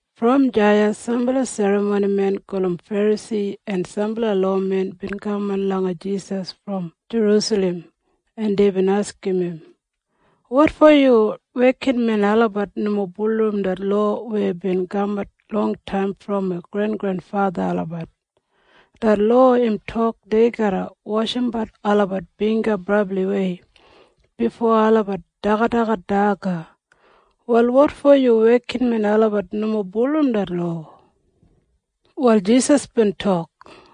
Brom deya sambala serramonimen gulum Ferasi en sambala lowamen bin kaman langa Jisas brom Jerusalem, en deibin askim im, “Wotfo yu wekinmen olabat nomo bulurrum det lowa weya bin kamat longtaim brom wi grengrenfatha olabat? Det lowa im tok dei garra washimbat olabat bingga brabliwei bifo olabat dagadagat daga. Wal wotfo yu wekinmen olabat nomo bulurrum det lowa?” Wal Jisas bin tok,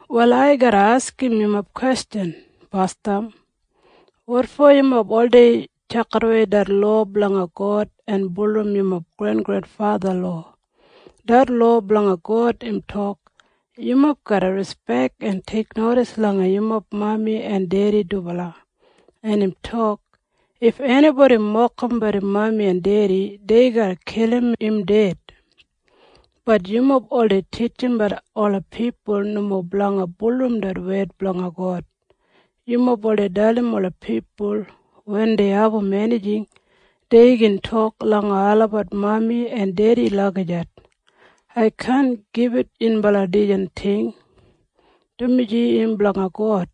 “Wal ai garra askim yumob kwestjan basdam. Wotfo yumob oldei tjakidawei det lowa blanga God en bulurrum yumob grengrenfatha lowa? Det lowa blanga God im tok, ‘Yumob garra rispek en teiknodis langa yumob mami en dedi dubala.’ En im tok, ‘If enibodi mokimbat im mami en dedi, dei garra kilim im ded.’ Bat yumob oldei titjimbat ola pipul nomo blanga bulurrum det wed blanga God. Yumob oldei dalim ola pipul wen dei abum enijing, dei gin tok langa olabat mami en dedi lagijat, ‘Ai kaan gibit yunbala dijan ting, dumaji im blanga God.’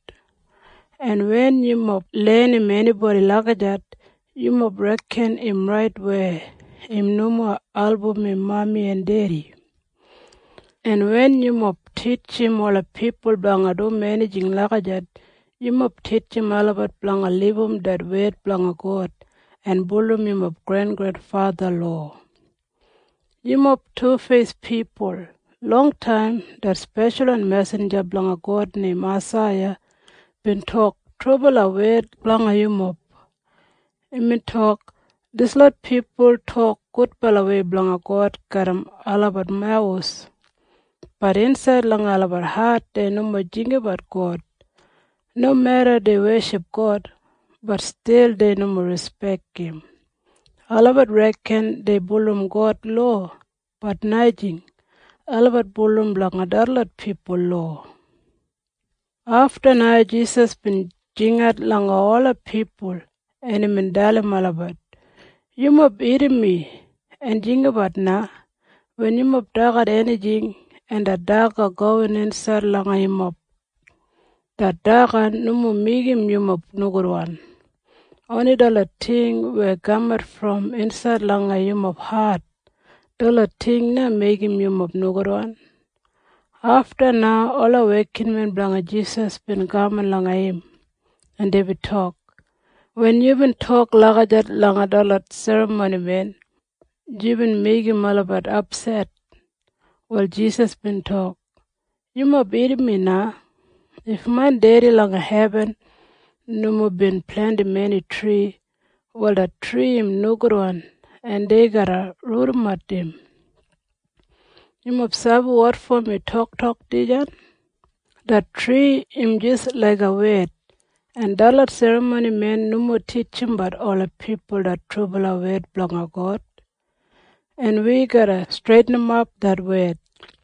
En wen yumob lenim enibodi lagijat, yumob reken im rait weya im nomo album im mami en dedi. En wen yumob titjim ola pipul blanga dum enijing lagijat, yumob titjim olabat blanga libum det wed blanga God en bulurrum yumob grengrenfatha lowa. “Yumob tufeis pipul! Longtaim det speshalwan mesinja blanga God neim Aisaiya bin tok trubala wed blanga yumob. Imbin tok, ‘Dislot pipul tok gudbalawei blanga God garram olabat mawus. Bat insaid langa olabat hat dei nomo jinggabat God. Nomeda dei weship God. Bat stil dei nomo rispek im. Olabat reken dei bulurrum God lowa. Bat najing. Olabat bulurrum blanga detlot pipul lowa.’” Afta na Jisas bin jingat langa ola pipul, en imbin dalim olabat, “Yumob irrim mi en jinggabat na. Wen yumob dagat enijing, en det daga gowin insaid langa yumob, det daga nomo meigim yumob nogudwan. Oni detlot ting weya kamat brom insaid langa yumob hat, detlot ting na meigim yumob nogudwan.” Afta na ola wekinmen blanga Jisas bin kaman langa im, en deibin tok, “Wen yubin tok lagijat langa detlot serramonimen, yubin meigim olabat apset.” Wal Jisas bin tok, “Yumob irrim mi na. If main Dedi langa hebin nomo bin plentim eni tri, wal det tri im nogudwan en dei garra rudimat im. Yumob sabi wotfo mi toktok dijan? Det tri im jis laiga wed, en detlot serramonimen nomo titjimbat ola pipul det trubala wed blanga God. En wi garra streitinimap det wed.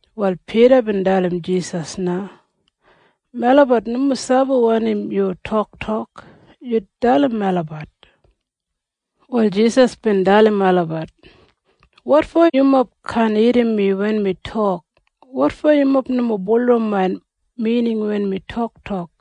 Wal Pida bin dalim Jisas na, “Melabat nomo sabi wanim yu toktok. Yu dalim melabat.” Wal Jisas bin dalim olabat, “Wotfo yumob kaan irrim mi wen mi tok? Wotfo yumob nomo bulurrum main mining wen mi toktok?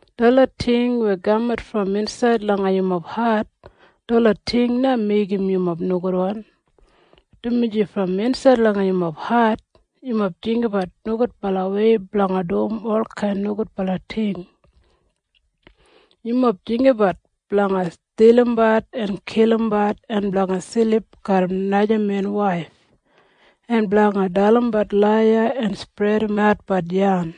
Detlot ting weya kamat brom insaid langa yumob hat, detlot ting na meigim yumob nogudwan, dumaji brom insaid langa yumob hat yumob jinggabat nogudbalawei blanga dum olkain nogudbala ting. Yumob jinggabat blanga stilimbat en kilimbat en blanga silip garram naja men waif en blanga dalimbat laiya en spredimatbat yan.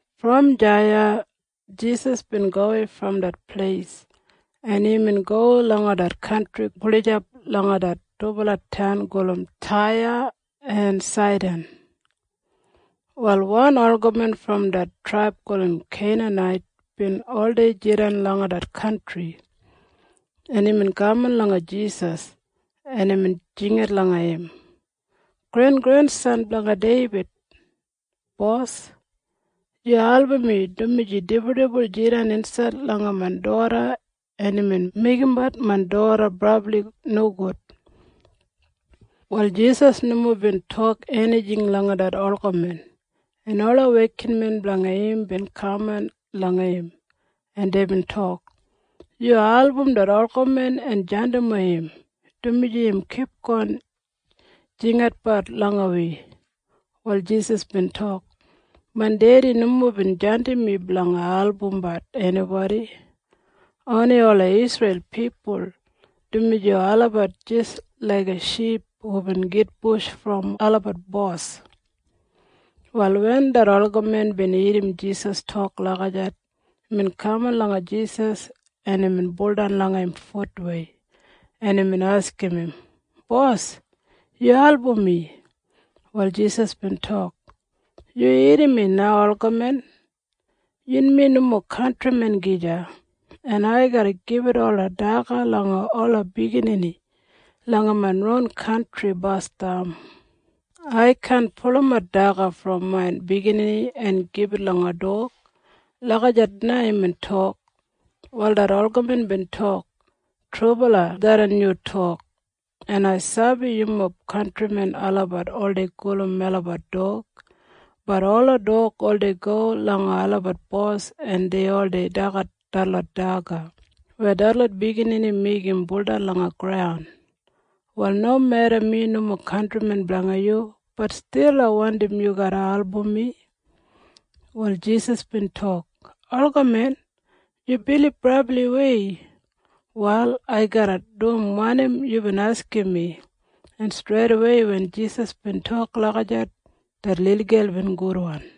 Brom deya Jisas bin gowei brom det pleis, en imbin go langa det kantri gulijap langa det dubala taun gulum Taya en Saidan. Wal wan olgamen brom det traib gulum Keinanait bin oldei jidan langa det kantri, en imbin kaman langa Jisas, en imbin jingat langa im, “Grengrensan blanga Deibid! Bos, yu album mi, dumaji dibuldibul jidan insaid langa main doda en imbin meigimbat main doda brabli nogud.” Wal Jisas nomo bin tok enijing langa det olgamen, en ola wekinmen blanga im bin kaman langa im, en deibin tok, “Yu album det olgamen en jandimwei im, dumaji im kipgon jingginatbat langa wi.” Wal Jisas bin tok, “Main Dedi nomo bin jandim mi blanga albumbat enibodi. Oni ola Isreil pipul, dumaji olabat jis laiga ship hubin gitbush brom olabat bos.” Wal wen det olgamen bin irrim Jisas tok lagijat, imbin kaman langa Jisas, en imbin baudan langa im futwei, en imbin askim im, “Bos, yu album mi!” Wal Jisas bin tok, “Yu irrim mi na, olgamen. Yunmi nomo kantrimen gija, en ai garra gibit ola daga langa ola biginini langa main ron kantri basdam. Ai kaan pulumat daga brom main biginini en gibit langa dog.” Lagijat na imbin tok. Wal det olgamen bin tok, “Trubala tharran yu tok. En ai sabi yumob kantrimen olabat oldei gulum melabat dog. Bat ola dog oldei go langa olabat bos, en dei oldei dagat detlot daga weya detlot biginini meigim buldan langa graun. Wal nomeda mi nomo kantrimen blanga yu, bat stil ai wandim yu garra album mi.” Wal Jisas bin tok, “Olgamen, yu bilib brabliwei! Wal ai garra dum wanim yubin askim mi.” En streidawei wen Jisas bin tok lagijat, det lilgel bin gudwan.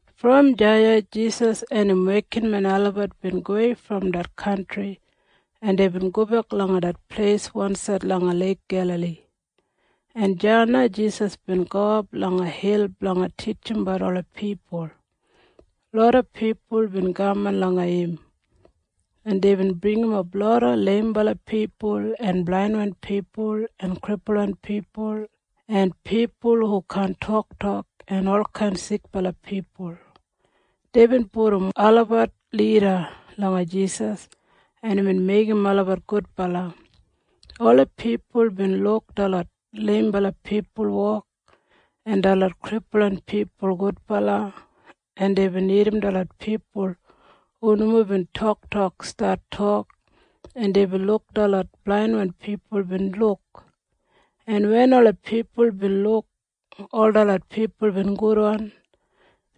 Brom deya Jisas en im wekinmen olabat bin gowei brom det kantri, en deibin gobek langa det pleis wansaid langa Leik Gelali, en deya na Jisas bin gowap langa hil blanga titjimbat ola pipul. Loda pipul bin kaman langa im, en deibin bringimap loda leimbala pipul en blainwan pipul en kripulwan pipul en pipul hu kaan toktok en olkain sikbala pipul. Deibin pudum olabat lida langa Jisas, en imbin meigim olabat gudbala. Ola pipul bin luk detlot leimbala pipul wok en detlot kripulwan pipul gudbala, en deibin irrim detlot pipul hu nomo bin toktok stat tok, en deibin luk detlot blainwan pipul bin luk. En wen ola pipul bin luk ol detlot pipul bin gudwan,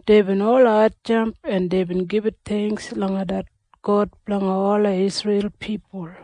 deibin ol hatjamp en deibin gibit theingks langa det God blanga ola Isreil pipul.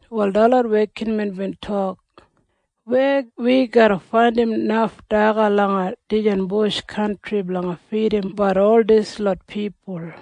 Wal detlot wekinmen bin tok, “Weya wi garra faindim naf daga langa dijan bush kantri blanga fidim ol dislot pipul?”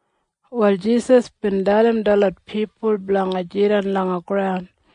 Wal Jisas bin dalim detlot pipul blanga jidan langa graun,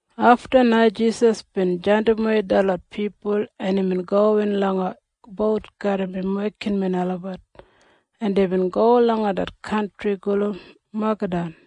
Afta na Jisas bin jandimwei detlot pipul, en imbin gowin langa bout garram im wekinmen olabat, en deibin go langa det kantri gulum Magadan.